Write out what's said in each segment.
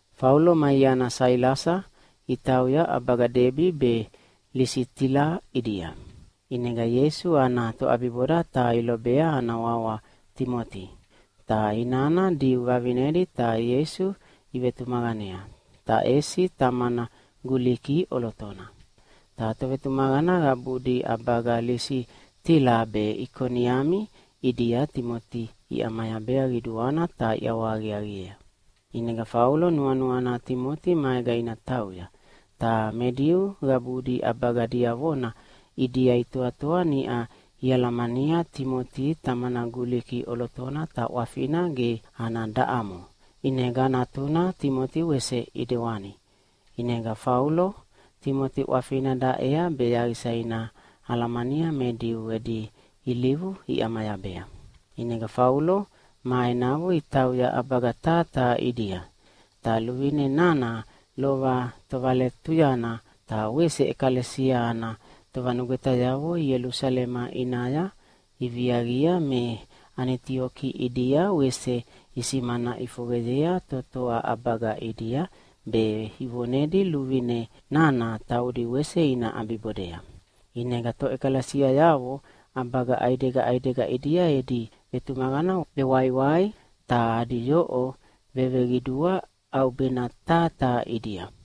Faulo ma iana Sailasa itauya ʼabaga Debi be Lisitila ʼidia. ʼInega Ieisu ana toʼabiboda taha ilobea ana wawa Timoti. Ta inana Diu vavinedi ta Ieisu ivetumaqanea, ta ʼesi tamana Guliki ʼolotona. Ta tovetumaqana qabudi ʼabaga Lisitila be Ikoniami ʼidia Timoti iʼamayabea qiduana ta iʼawahaqiaqiea. ʼInega Faulo nuanuana Timoti maega ina tauya, ta me Diu qabudi ʼabaga diavona ʼidia itoatoa niʼa ialamania Timoti tamana Guliki ʼolotona ta ʼwafina ge ana daʼamo, ʼinega natuna Timoti wese ʼidewani. ʼInega Faulo Timoti ʼwafina daʼea be yaqisa ina alamania me Diu edi ilivu iʼamayabea. ʼInega Faulo ma enavo itauya ʼabaga taha taha ʼidia. Ta luvine nana lova tovaletuyana ta wese ʼekalesia ana tovanugwetayavo Ielusalema ʼinaya iviaqia me Anitioki ʼidia wese isimana ʼifoqeyea totoa ʼabaga ʼidia, be ivonedi luvine nana taudi wese ina ʼabibodea. ʼInega toʼekalesiayavo ʼabaga ʼaidega ʼaidega ʼidia edi vetumaqana vewaiwai ta adi yoʼo veveqidua ʼaubena taha taha ʼidia.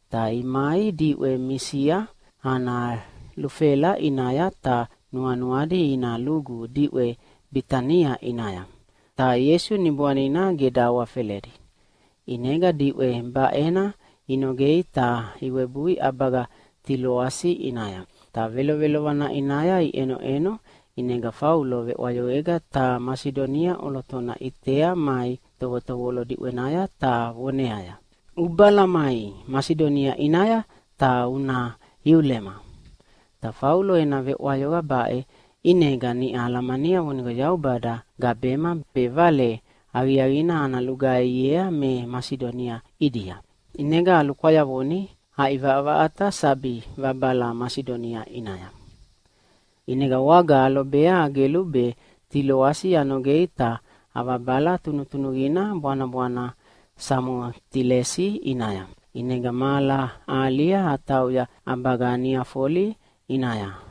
Ta imai diʼwe Misia ana lufela ʼinaya, ta nuanuadi ina lugu diʼwe Bitania ʼinaya. Ta Ieisu Niboanina ge dahawafeledi. ʼInega diʼwe baʼena inogei ta iwebui ʼabaga Tiloasi ʼinaya. Ta velovelovana ʼinaya iʼenoʼeno ʼinega Faulo veʼwayoqega taha Masidonia ʼolotona ʼitea mai tovotovolo diʼwenaya ta voneaya, “Ubala mai Masidonia ʼinaya ta una iulema!” Ta Faulo ena veʼwayoqa baʼe ʼinega niʼa alamania vonigo Yaubada gabema be Vale Aqiaqina ana lugaihiea me Masidonia ʼidia. ʼInega alukwayavoni aʼivaʼavaʼata sabi vabala Masidonia ʼinaya. ʼInega waga alobea agelu be Tiloasi anogei ta avabala tunutunuqina bwanabwana Samotilesi ʼinaya. ʼInega mahala ahalia atauya ʼabaga Niafoli ʼinaya.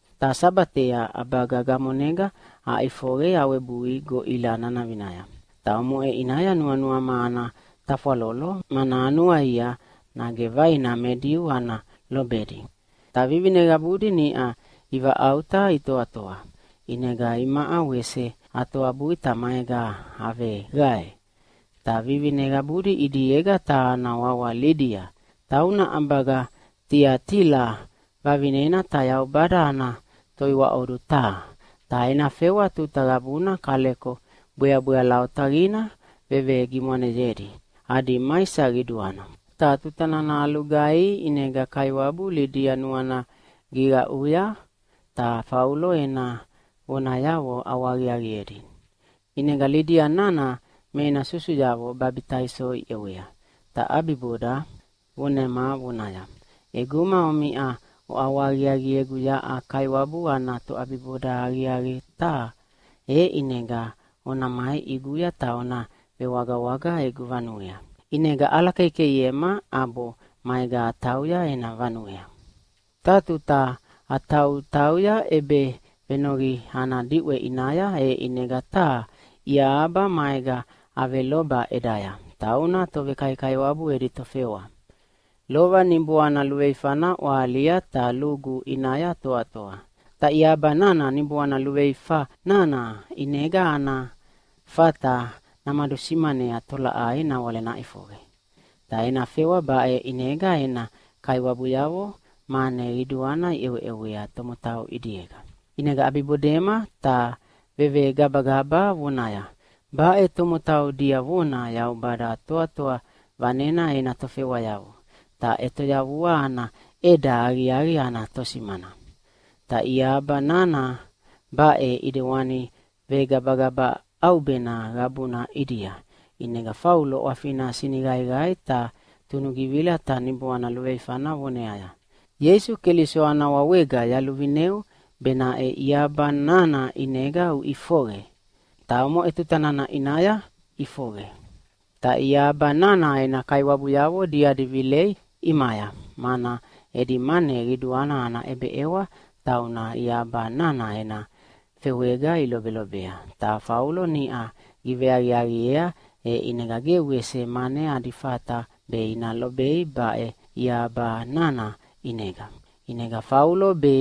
Ta Sabatea ʼabaga gamonega aʼifoqe awebui goʼila nanavinaya. Ta omoʼe ʼinaya nuanuama ana tafwalolo, mana anuaia nage vaina me Diu ana lobedi. Ta vivine qabudi niʼa ivaʼauta itoatoa, ʼinega imaʼa wese atoabui ta maega aveqae. Ta vivine qabudi ʼidiega taha ana wawa Lidia. Tauna ʼabaga Tiatila vavinena ta Yaubada ana toiwaʼodu taha. Ta ena fewa tuta qabuna kaleko bweabweala otaqina vevegimwaneyedi adi maisa qiduana. Ta tuta nana alugaihi ʼinega Kaiwabu Lidia nuana giqaʼuya ta Faulo ena vonayavo ʼawahaqiaqiedi. ʼInega Lidia nana me ena susuyavo babitaiso iʼewea, ta ʼabiboda vonema vonaya, “ʼEguma omiʼa oʼawahaqiaqiegu yaʼa Kaiwabu ana toʼabiboda aqiaqi taha, e ʼinega ona mai ʼiguya ta ona vewagawaga egu vanuea.” ʼInega ʼalakeikeiema ʼabo maega atauya ena vanuea. Taha tuta atautauya ʼebevenoqi ana diʼwe ʼinaya, e ʼinega taha iahaba maega aveloba ʼedaya, tauna tovekaikaiwabu edi tofewa. Lova niboana luveifana ʼwahalia ta lugu ʼinaya toatoa. Ta iahaba nana niboana luveifa nana ʼinega ana fata namadusimanea tolaʼai nawale naʼifoqe. Ta ena fewa baʼe ʼinega ena kaiwabuyavo mane qiduana iʼeweʼewea tomotau ʼidiega. ʼInega ʼabiʼabibodema ta vevegabagaba vonaya, “Baʼe tomotau diavona Yaubada Toatoa Vanena ena tofewayavo, ta ʼetoyavua ana ʼeda aqiaqi ana tosimana.” Ta iahaba nana baʼe ʼidewana vegabagaba ʼaubena qabuna ʼidia, ʼinega Faulo ʼwafina siniqaiqai ta tunugivila ta niboana luveifana voneaya, “Ieisu Keliso ana wawega yaluvineu benaʼe iahaba nana ʼinega uʼifoqe!” Ta omoʼe tuta nana ʼinaya ʼifoqe. Ta iahaba nana ena kaiwabuyavo diadi vilea ʼimaya, mana edi mane qiduana ana ʼebeʼewa tauna iahaba nana ena fewega ilobelobea, ta Faulo niʼa giveaqiaqiea, e ʼinega ge wese mane adi fata be ina lobei baʼe iaba nana ʼinega. ʼInega Faulo be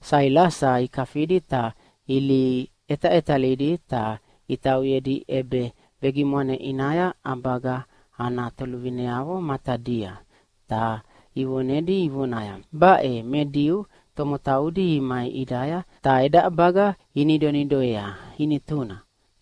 Sailasa ikafidi ta ilihi ʼetaʼetalidi ta itauyedi ʼebevegimwane ʼinaya ʼabaga ana toluvineavo matadia, ta ivonedi ivonaya, “Baʼe me Diu tomotaudi imai ʼidaya ta eda ʼabaga inidonidoea inituna,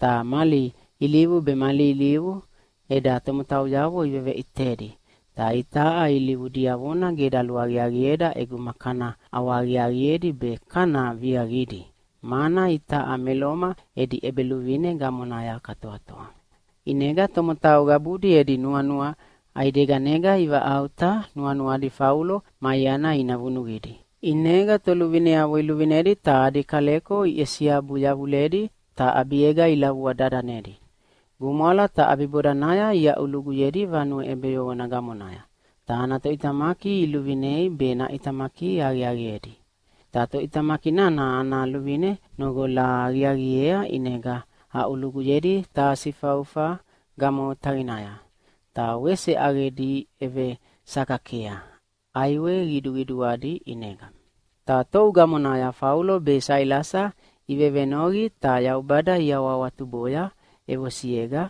ta mali ilivu be mali ilivu eda tomotauyavo iveveʼitedi, ta itaʼa ilivu diavona ge daluaqiaqieda ʼeguma kana ʼawahaqiaqiedi be kana viaqidi, mana itaʼa me Loma edi ʼebeluvine gamonaya katoatoa.” ʼInega tomotau qabudi edi nuanua ʼaideganega ivaʼauta nuanuadi Faulo ma iana ina vunuqidi, ʼinega toluvineavo iluvinedi ta adi kaleko iʼesiabu yavuledi ta ʼabiega ilavua dadanedi. Gumwala, ta ʼabibodanaya iaʼuluguyedi vanue ʼebeyoqona gamonaya. Ta ana toʼitamaki iluvinei be naʼitamaki aqiaqiedi. Ta toʼitamaki nana ana luvine noqola aqiaqiea, ʼinega aʼuluguyedi taha sifaufa gamo otaqinaya. Ta wese ʼaqedi ʼevesakakea ʼaiwe qiduqiduadi ʼinega. Ta tou gamonaya Faulo be Sailasa ivevenoqi ta Yaubada iawahawatuboya ʼevosiega,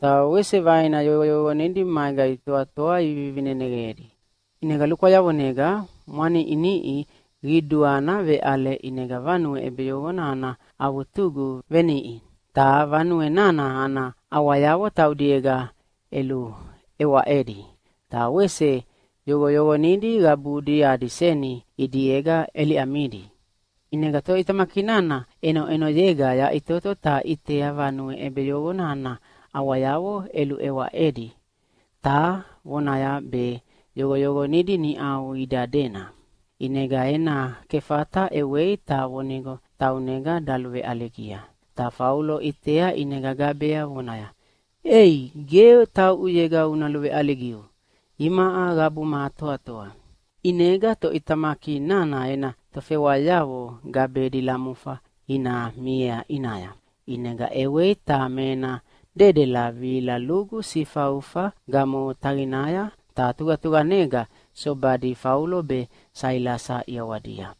ta wese vaina yoqoyoqonidi maega itoatoa ivivineneqedi. ʼInega lukwayavonega mwaniʼiniʼi qiduana veʼale, ʼinega vanue ʼebeyoqona ana avutugu veniʼi. Ta vanue nana ana ʼawayavo taudiega ʼeluʼewaʼedi, ta wese yoqoyoqonidi qabudi adi seni ʼidiega ʼeliʼamidi. ʼInega toʼitamaki nana ʼenoʼenoyega yaʼitoto ta ʼitea vanue ʼebeyoqona ana ʼawayavo ʼeluʼewaʼedi ta vonaya be yoqoyoqonidi niʼau ida dena. ʼInega ena kefata ʼewei ta vonigo taunega daluveʼaligia. Ta Faulo ʼitea ʼinega gabea vonaya, “Ei, ge tauʼuyega una luveʼaligiu! Imaʼa qabuma atoatoa.” ʼInega toʼitamaki nana ena tofewayavo gabedi lamufa ina miea ʼinaya. ʼInega ʼewei ta me ena dedela vihila lugu sifaufa gamo otaqinaya ta tuqatuqanega sobadi Faulo be Sailasa ʼiawadia.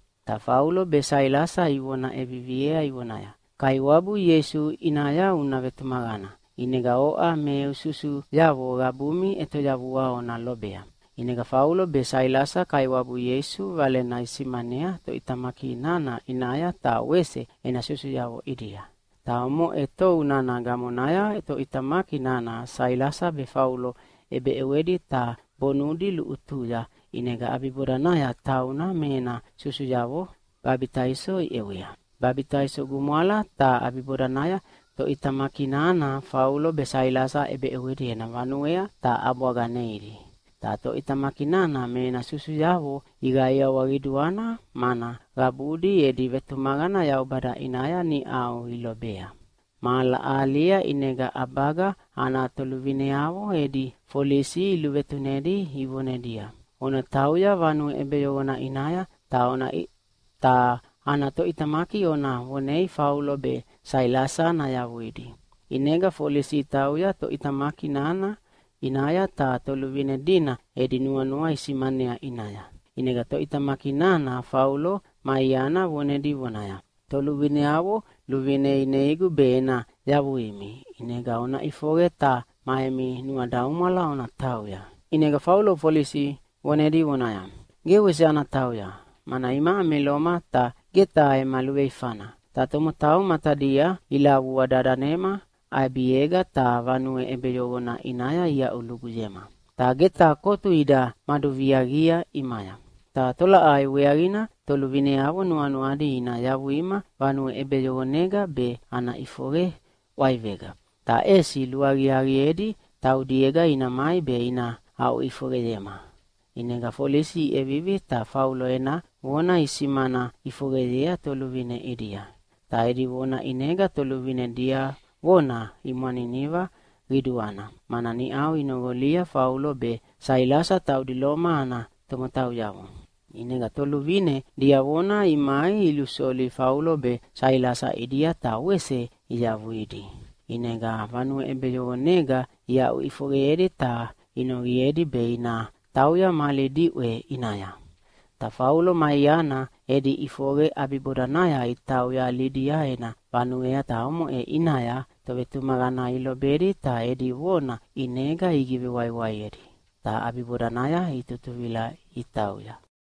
Ta Faulo be Sailasa ivona ʼeviviea ivonaya, “Kaiwabu Ieisu ʼinaya una vetumaqana, ʼinega oʼa me eu susuyavo qabumi ʼetoyavua ona lobea.” ʼInega Faulo be Sailasa Kaiwabu Ieisu Valena isimanea toʼitamaki nana ʼinaya ta wese ena susuyavo ʼidia. Ta omoʼe tou nana gamonaya toʼitamaki nana Sailasa be Faulo ʼebeʼewedi ta bonudi luʼutuya, ʼinega ʼabibodanaya tauna me ena susuyavo babitaiso iʼewea. Babitaiso gumwala, ta ʼabibodanaya toʼitamaki nana Faulo be Sailasa ʼebeʼewedi ena vanuea ta ʼabwaga neidi. Ta toʼitamaki nana me ena susuyavo iqaiawa qiduana, mana qabudi edi vetumaqana Yaubada ʼinaya niʼau ilobea. Mahala ahalia ʼinega ʼabaga ana toluvineavo edi folisi iluvinedi ivonedia, “Ona tauya vanue ʼebeyoqona ʼinaya, ta ana toʼitamaki ona vonei Faulo be Sailasa nayavuidi.” ʼInega folisi itauya toʼitamaki nana ʼinaya ta toluvine dina edi nuanua isimanea ʼinaya. ʼInega toʼitamaki nana Faulo ma iana vonedi vonaya, “Toluvineavo luvine ineigu be ena yavuimi. ʼInega ona ʼifoqe ta ma emi nuadaumwala ona tauya.” ʼInega Faulo folisi vonedi vonaya, “Ge wese ana tauya! Mana imaʼa me Loma ta ge taha ema luveifana, ta tomotau matadia ilavua dadanema ʼabiega, ta vanue ʼebeyoqona ʼinaya iaʼuluguyema, ta ge taha kotu ida maduviaqia ʼimaya. Ta tolaʼai weaqina toluvineavo nuanuadi ina yavuima vanue ʼebeyoqonega be ana ʼifoqe ʼwaivega? Ta ʼesi luaqiaqiedi taudiega ina mai be ina aʼuʼifoqeyema!” ʼInega folisi iʼevivi ta Faulo ena vona isimana ʼifoqeyea toluvine ʼidia. Ta edi vona ʼinega toluvine diavona imwaniniva qiduana, mana niʼau inoqolia Faulo be Sailasa taudi Loma ana tomotauyavo. ʼInega toluvine diavona imai ilusoli Faulo be Sailasa ʼidia ta wese iyavuidi. ʼInega vanue ʼebeyoqonega iaʼuʼifoqeyedi ta inoqiedi be ina tauya mali diʼwe ʼinaya. Ta Faulo ma iana edi ʼifoqe ʼabibodanaya itauya Lidia ena vanuea, ta omoʼe ʼinaya tovetumaqana ilobedi ta edi vona ʼinega igivewaiwaiedi. Ta ʼabibodanaya itutuvila itauya.